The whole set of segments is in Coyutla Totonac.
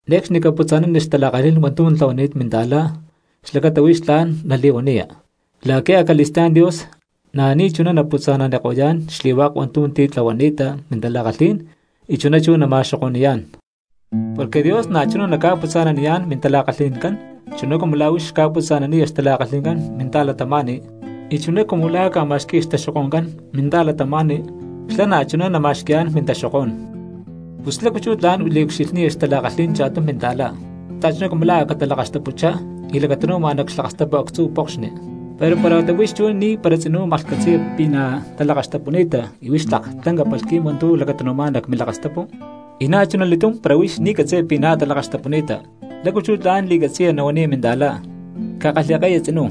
’Ne̠cxni caputza̠nani xtala̠kalhí̠n hua̠ntu̠ tlahuani̠t minta̠cristiano xlacata huix tla̠n nali̠huaniya, la̠qui̠ acali̠stá̠n Dios na̠ ni̠chuná naputza̠naniko̠yá̠n xli̠hua̠k hua̠ntu̠ titlahuani̠ta mintala̠kalhí̠n y chuná chú nama̠xoko̠ni̠yá̠n. Porque Dios na̠chuná naca̠putza̠naniyá̠n mintala̠kalhí̠n chuná cumu la̠ huix xca̠putza̠naniya xtala̠kalhi̠ncán minta̠cristianoscán; y chuná cumu la̠ ca̠ma̠xqui̠ya xtaxoko̠ncán minta̠cristianoscán xlá na̠chuná nama̠xqui̠yá̠n mintaxokó̠n. Pus, ¿lácu chú tla̠n liucxilhniya xtala̠kalhí̠n cha̠tum minta̠cristiano, xta̠chuná cumu la̠ a̠ catalakaxtapuchá y lacatanu̠ma nac xlakastapu actzu pokxni, pero para huata huix chú ni̠para tzinú maklhcatzi̠ya pi̠ na̠ talakaxtapuni̠ta y huix tlak lanca palhqui̠m hua̠ntu̠ lacatanu̠má̠n nac milakastapu? Y na̠chuna li̠túm para huix ni̠ catzi̠ya pi̠ na̠ talakaxtapuni̠ta, ¿lácu chú tla̠n li̠catzi̠ya huaniya minta̠cristiano: “Cakalhi̠ke̠ya tzinú,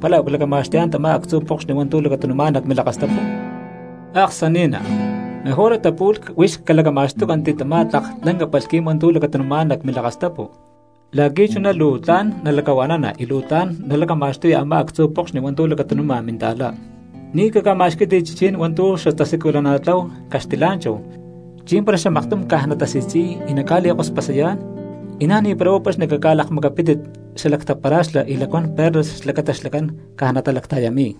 pala u̠clacama̠xtuyá̠n tamá actzu pokxni hua̠ntu̠ lacatanu̠má̠n nac milakastapu”? ¡Aksani̠ná! Mejor huata pu̠lh huix calacama̠xtúcanti tamá tlak lanca palhqui̠m hua̠ntu̠ lacatanu̠má̠n nac milakastapu la̠qui̠ chuná luu tla̠n nalacahua̠nana y luu tla̠n nalacama̠xtuya a̠má actzu pokxni hua̠ntu̠ lacatanu̠ma minta̠cristiano. ’Ni̠ caca̠ma̠xquí̠tit chichí̠n hua̠ntu̠ xatasiculana̠tlahu caxtilá̠nchahu chi̠mpara xamaktum caj natasi̠tzi̠y y naca̠li̠kospasayá̠n; y na̠ ni̠para huá paxni caca̠lakmacapítit xalactapara̠xlá y lacuán perlas xlacata xlacán caj natalacta̠yami̠y.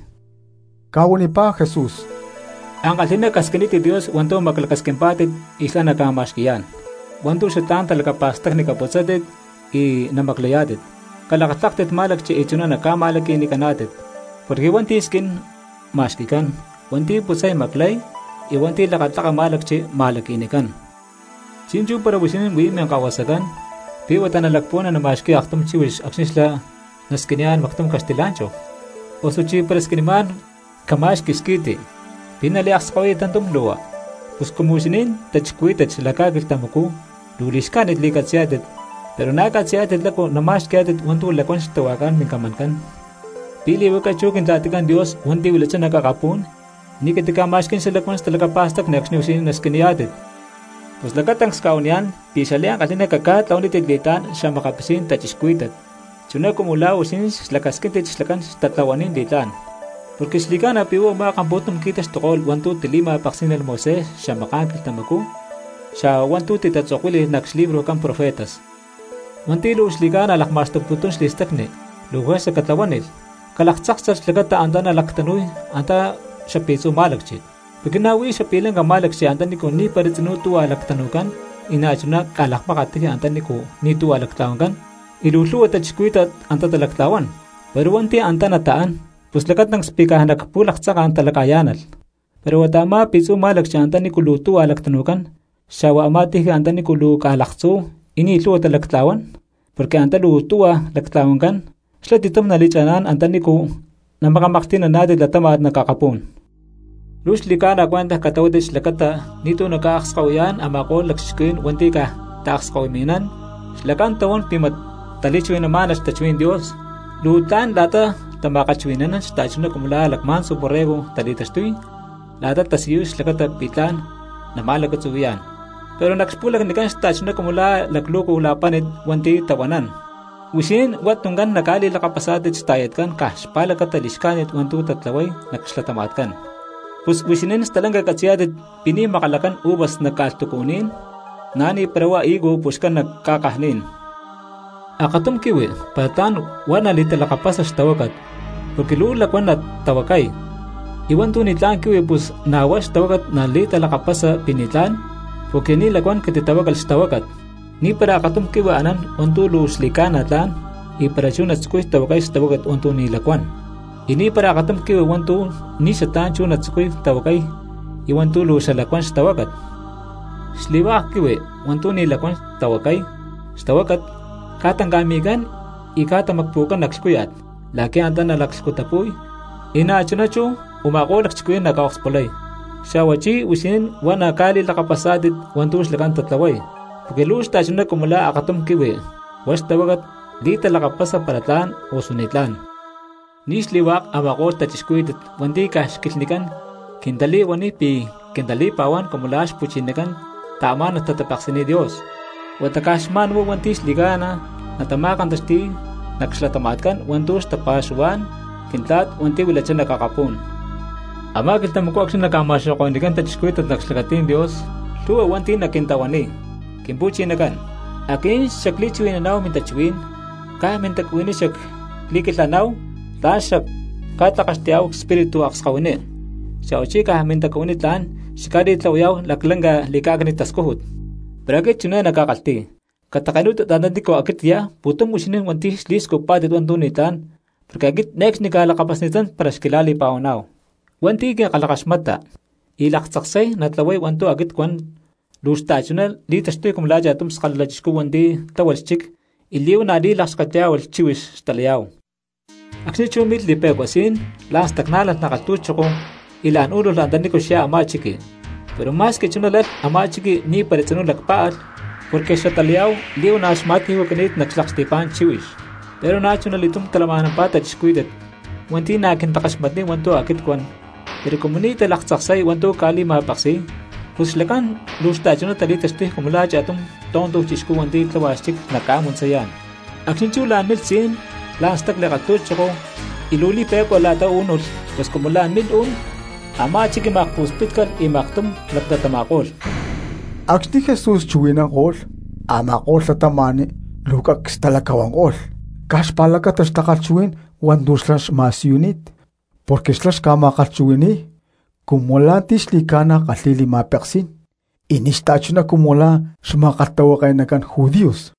Ca̠huanipá Jesús: —Ankalhi̠ná casquinítit Dios hua̠ntu̠ maclacasquimpá̠tit y xlá naca̠ma̠xqui̠yá̠n; hua̠ntu̠ xatlá̠n talacapa̠stacni caputzátit y namaclayá̠tit, calakatláktit má̠lacchi y chuná naca̠ma̠laqui̠nicaná̠tit. Porque hua̠nti̠ squín ma̠xqui̠cán, hua̠nti̠ putzay maclay, y hua̠nti̠ lakatlaka má̠lacchi ma̠laqui̠nicán. ’Chi̠nchú para huixinín huí minkahuasacán, ¿pi̠ huata nalacpuhuana nama̠xqui̠ya aktum chíhuix acxni̠ xlá nasquiniyá̠n mactum caxtilá̠nchahu? Osuchi para squinimá̠n cama̠xqui squi̠ti, ¿pi̠ naliakskahuiya tantum lu̠hua? Pus cumu huixinín cristianos xalac ca̠quilhtamacú luu li̠xcájnit li̠catzi̠yá̠tit, pero na̠ catzi̠yá̠tit lácu nama̠xqui̠yá̠tit hua̠ntu̠ lacuán xtahuajcán mincamancán, ¿pi̠ li̠huaca chú Quintla̠ticán Dios hua̠nti̠ huilachá nac akapú̠n ni̠ catica̠ma̠xquí̠n xalacuán talacapa̠stacni acxni̠ huixinín nasquiniyá̠tit? ’Pus lacatancs cca̠huaniyá̠n pi̠ xliankalhi̠ná caca̠tlahuanítit li̠tlá̠n xa̠makapitzí̠n cristianos chuná cumu la̠ huixinín xlacasquíntit xlacán xtatlahuanín li̠tlá̠n. Porque xli̠ca̠na pi̠ huá u̠má kampu̠tum qui̠taxtuko̠lh hua̠ntu̠ tili̠ma̠peksí̠nalh Moisés xamaká̠n quilhtamacú xa̠hua hua̠ntu̠ titatzokuíli̠lh nac xlibrojcán profetas. ’Hua̠nti̠ luu xli̠ca̠na lakma̠xtuputún xli̠stacni luu juerza catlahuánilh calaktzáksalh xlacata antá nalactanu̠y nac xapi̠tzu má̠lacchi. Porque na̠ huí xapi̠lanca má̠lacchi antanícu ni̠para tzinú tuhua lactanu̠cán y na̠chuná ca̠lakmákat tiji antanícu ni̠ tuhua lactla̠huancán, y luu lhu̠hua cristianos antá talactla̠huán, pero hua̠nti̠ antá nataán pus lacatancs pi̠ caj nac pu̠laktzanka̠n talacayá̠nalh. Pero huata a̠má pi̠tzu̠ má̠lacchi antanícu luu tuhua lactanu̠cán, xa̠hua a̠má tiji antanícu luu ca̠laktzú y ni̠ lhu̠hua talactla̠huán porque antá luu tuhua lactla̠huancán, xlá ti̠tum naca̠li̠cha̠ná̠n antanícu namakamaklhti̠naná̠tit latáma̠t nac akapú̠n. ’Luu xli̠ca̠na cuentaj catlahuátit xlacata ni̠tu̠ naca̠akskahuiyá̠n a̠ma̠ko̠lh lacchixcuhuí̠n hua̠nti̠ caj taakskahuimi̠nán xlacán tahuán pi̠ mat huá tali̠chuhui̠namá̠nalh, xtachuhuí̠n Dios. Luu tlán la̠ta tama̠kalhchuhui̠ni̠nán xta̠chuná cumu la̠ lacma̠ntzu borrego tali̠taxtuy la̠ta tatasiyuy xlacata pi̠ tla̠n naca̠ma̠lacatzuhui̠yá̠n, pero nac xpu̠lacnicán xta̠chuná cumu la̠ xalaclu̠cu la̠páni̠t hua̠nti̠ tahuanán. Huixinín huá tuncán naca̠li̠lakapasá̠tit xta̠yatcán caj xpa̠lacata li̠xcájnit hua̠ntu̠ tatlahuay nac xlatama̠tcán. Pus huixinín stalanca catzi̠yá̠tit pi̠ ni̠ makalacán uvas nac ca̠lhtucuní̠n, na̠ ni̠para huá higo puxcán nac ca̠kajní̠n. Akatum quihui para tla̠n huá nali̠talakapasa xtahuácat porque luu lacuán natahuacay, y hua̠ntu̠ ni̠tlá̠n quihui pus na̠ huá xtahuácat nali̠talakapasa pi̠ ni̠tlá̠n porque ni̠ lacuán catitahuácalh xtahuácat. Ni̠para akatum quihui anán hua̠ntu̠ luu xli̠ca̠na tla̠n y para chú natzucuy tahuacay xtahuácat hua̠ntu̠ ni̠ lacuán, y ni̠para akatum quihui hua̠ntu̠ ni̠ xatlá̠n chú natzucuy tahuacay hua̠ntu̠ luu xalacuán xtahuácat. Xli̠hua̠k quihui hua̠ntu̠ ni̠ lacuán tahuacay xtahuácat ca̠tanca̠mi̠cán y tamacpu̠cán nac lhcúya̠t la̠qui̠ antá nalaclhcutapu̠y, y na̠chuná chú u̠ma̠ko̠lh lacchixcuhuí̠n naca̠okspulay. Xa̠huachí huixinín huá naca̠li̠lakapasá̠tit hua̠ntu̠ xlacán tatlahuay, porque luu xta̠chuná cumu la̠ akatum quihui huá xtahuácat li̠talakapasa para tla̠n osu ni̠tlá̠n. ’Ni̠ xli̠hua̠k a̠ma̠ko̠lh cristianos hua̠nti̠ caj xquilhnicán quintali̠huaniy pi̠ quintali̠pa̠huán cumu lá xpu̠chinacán taamá̠nalh tatapeksi̠niy Dios, huata caj xma̠nhuá hua̠nti̠ xli̠ca̠na natama̠kantaxti̠y nac xlatama̠tcán hua̠ntu̠ xtapa̠xuhuá̠n Quintla̠t hua̠nti̠ huilachá nac akapú̠n. Amá quilhtamacú acxni̠ naca̠ma̠xoko̠ni̠cán cristianos nac xlacatí̠n Dios, lhu̠hua hua̠nti̠ naquintahuaniy: “Quimpu̠chinacán, aquinín xacli̠chuhui̠naná̠hu mintachuhuí̠n, caj mintacuhuiní xacli̠quilhaná̠hu tlán xacca̠tlakaxtuyá̠hu xespíritu akskahuiní, xa̠huachí caj mintacuhuiní tla̠n xacca̠li̠tlahuayá̠hu laclanca li̠cá̠cni̠t tascújut.” Pero aquit chiné nacca̠kalhti̠y: “Catake̠nú̠tit antanícu aquit cyá pu̠tum huixinín hua̠nti̠ xli̠scujpá̠tit hua̠ntu̠ ni̠tlá̠n porque aquit ne̠cxni cca̠lakapasni̠tán para xquila̠li̠pa̠huaná̠hu.” ’Hua̠nti̠ quinkalhakaxmata y laktzaksay natlahuay hua̠ntu̠ aquit cuán luu xta̠chuná li̠taxtuy cumu la̠ cha̠tum skalala chixcú hua̠nti̠ tláhualh xchic y li̠huana̠ li̠lakxketyá̠hualh chíhuix xtalayá̠hu. Acxni̠ chú milh li̠pe̠cua sí̠n, la̠n stacná̠nalh nac kalhtu̠choko, y la̠n ú̠nulh antanícu xyá a̠má chiqui; pero ma̠squi chuná lalh a̠má chiqui ni̠para tzinú lacpá̠alh porque xatalayá̠hu li̠huana̠ xma̠ti̠ju̠cani̠t nac xlaksti̠pá̠n chíhuix. Pero na̠chuna li̠túm, talama̠nampá cristianos hua̠nti̠ na̠ quintakaxmatniy hua̠ntu̠ aquit cuan, pero cumu ni̠ talaktzaksay hua̠ntu̠ cca̠li̠ma̠peksi̠y pus xlacán luu xta̠chuná tali̠taxtuy cumu la̠ cha̠tum tonto chixcú hua̠nti̠ tlahuay xchic nac ca̠muntzayá̠n. Acxni̠ chú la̠n milh sí̠n, la̠n stacli kalhu̠choko, y luu li̠pe̠cua la̠ta ú̠nulh, pus cumu la̠n milh uú̠n, ¡a̠má chiqui ma̠kpu̠spítcalh y maktum laclatama̠ko̠lh! Acxni̠ Jesús chuhui̠nanko̠lh, a̠ma̠ko̠lh cristianos luu cacs talacahuanko̠lh caj xpa̠lacata xtakalhchuhuí̠n hua̠ntu̠ xlá xma̠siyuni̠t. Porque xlá xca̠ma̠kalhchuhui̠ni̠y cumu la̠ ti̠ xli̠ca̠na kalhi̠y li̠ma̠peksí̠n y ni̠ xta̠chuná cumu lá xma̠kalhtahuake̠nacán judíos.